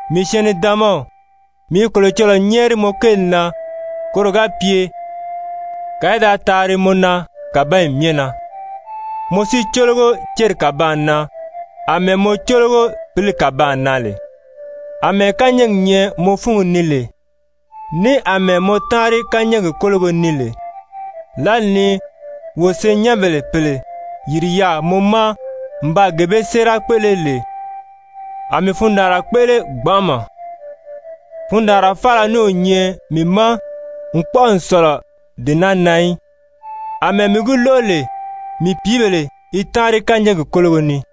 Mii syɛɛn-nidaanmaw, mii i Kolocɔlɔɔ nyɛ́ɛri mɔ kéeli na koro ga pye kàa í da taari mɔ na kàbanyi myɛ na, mɔ si cólogo céri kàbaan na àmɛɛ mɔ cólogo pǐli kàbaan na lè. Amɛɛ kányɛɛgi nyɛ mɔ fúngi ni lè, ní àmɛɛ mɔ táanri kányɛɛgi kólogo ni lè, lǎli ni wo senyɛnbèle pèle yìri yaà mɔ ma n baa gee bee séera kpéʔele lè, a mii fundaanra kpéʔele gbanʔama. Fundaanraa faala ní o nyɛ mii ma n kpɔ́ʔɔ n sɔ̀lɔ dee naa na í, àmɛɛ mii gi lóʔo lè mii pìíbèle i táanri kányɛɛgi kólogo ni.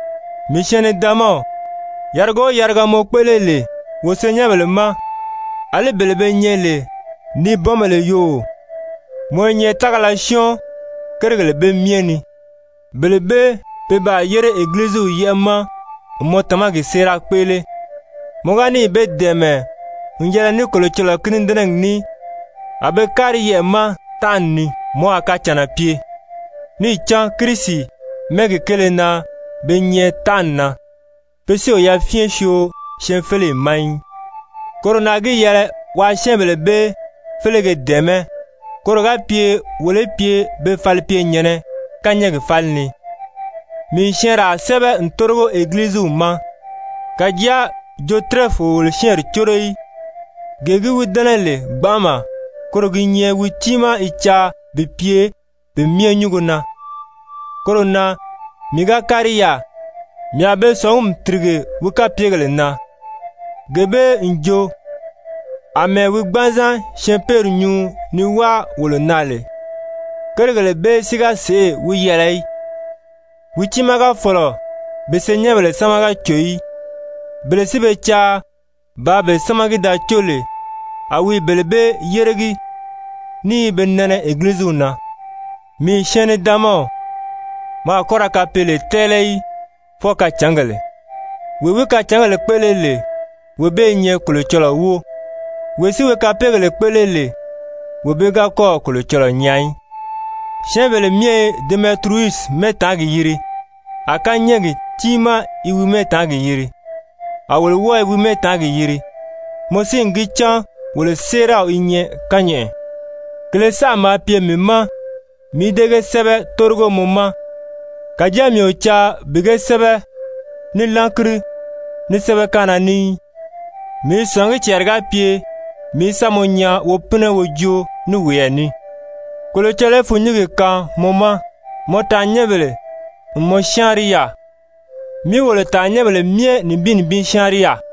Mii syɛɛn-nidaanmaw, yariga o yariga mɔ kpéʔele lè wo senyɛnbèle ma, àlí bele be nyɛ lè nibɔnbèle yoo, mɔ i nyɛ tágala syɔ́ɔn kérigèle bee myɛ ni. Bele bee pe baa yére Egiliziw yɛ́ʔɛ ma n mɔ tamagi séera kpéʔele. Mɔ ga níì be dɛ̀ɛmɛ n yɛlɛ ní Kolocɔlɔɔ kínidɛnɛgi ní a be kári yɛʔɛ̀ ma tánʔani ni, mɔ a kacànna pye. Níì cán Kirisi mɛ́ɛgi kéele na be nyɛ tánʔani na, pe si o yafyɛn syoo syɛɛnfeleyi ma í. Koro na gi yɛlɛ waa syɛ́ɛnbèle bee félege dɛ̀ɛmɛ́ koro ga pye wolo í pye be falipyenyɛ̀nnɛ kányɛɛgi fáli ni. Mii n syɛɛnraa sɛ́bɛ n tórigo Egiliziw ma. Kàjáa Jotirɛfi o wolo syɛ́ɛnri córo í, gee gi wi dɛ́nɛ lè gbanʔama, koro gi nyɛ wi tiimaa i caa bi pye pe myɛ nyúngo na. Koro na mii ga kári yaà, mii a be sɔ̀ngumi tìrige wi kapyegèle na, gee bee n jo àmɛɛ wi gbanzan syɛɛnpeeri nyuu ni wáa wolo na lè. Kérigèle bee si ga sèʔê wi yɛlɛ í, wi tiimaa ga fɔ̀lɔ bi senyɛnbèle sámaga cò í, bele si be caa bàā be sámagi da có lè, a wi i bele bee yéregi, ní i be nɛnɛ Egiliziw na. Mii syɛɛn-nidaanmaw, mɔ a kɔ́ ra kapeele tɛ́ɛlɛ í, fwɔɔ kacǎngèle. Wee wi kacǎngèle kpéʔele lè, wee bee i nyɛ Kolocɔlɔɔ wóo. Wee si wi kapeegèle kpéʔele lè, wee bee ga kɔ́ɔ̀ Kolocɔlɔɔ nyaa í. Syɛ́ɛnbèle myɛ i Demɛtiriyusi mɛ́ɛtaangi yiri, a kányɛɛgi tiimaa i wi mɛ́ɛtaangi yiri, a wolo wɔ́ɔ i wi mɛ́ɛtaangi yiri. Mɔ si n gi cán wolo séeraw i nyɛ kányɛʔɛ. Kèlē saʔa maa pye mii ma mii í dée ge sɛ́bɛ tórigo mɔ ma, kàjáa mii o caa bi ge sɛ́bɛ ní lángiri, ní sɛ́bɛkaanna ní í. Mii i sɔ̀ngí cɛɛri ga pye mii í sa mɔ nyaa wo pínɛ wo joo ní woyɛɛ ní. Kolocɔlɔɔ í fûnnyingi kaan mɔ ma! Mɔ taannyɛnbèle n mɔ syáanri yaà. Mi wolo tàannyɛnbèle myɛ nibin nibin syáanri yaà.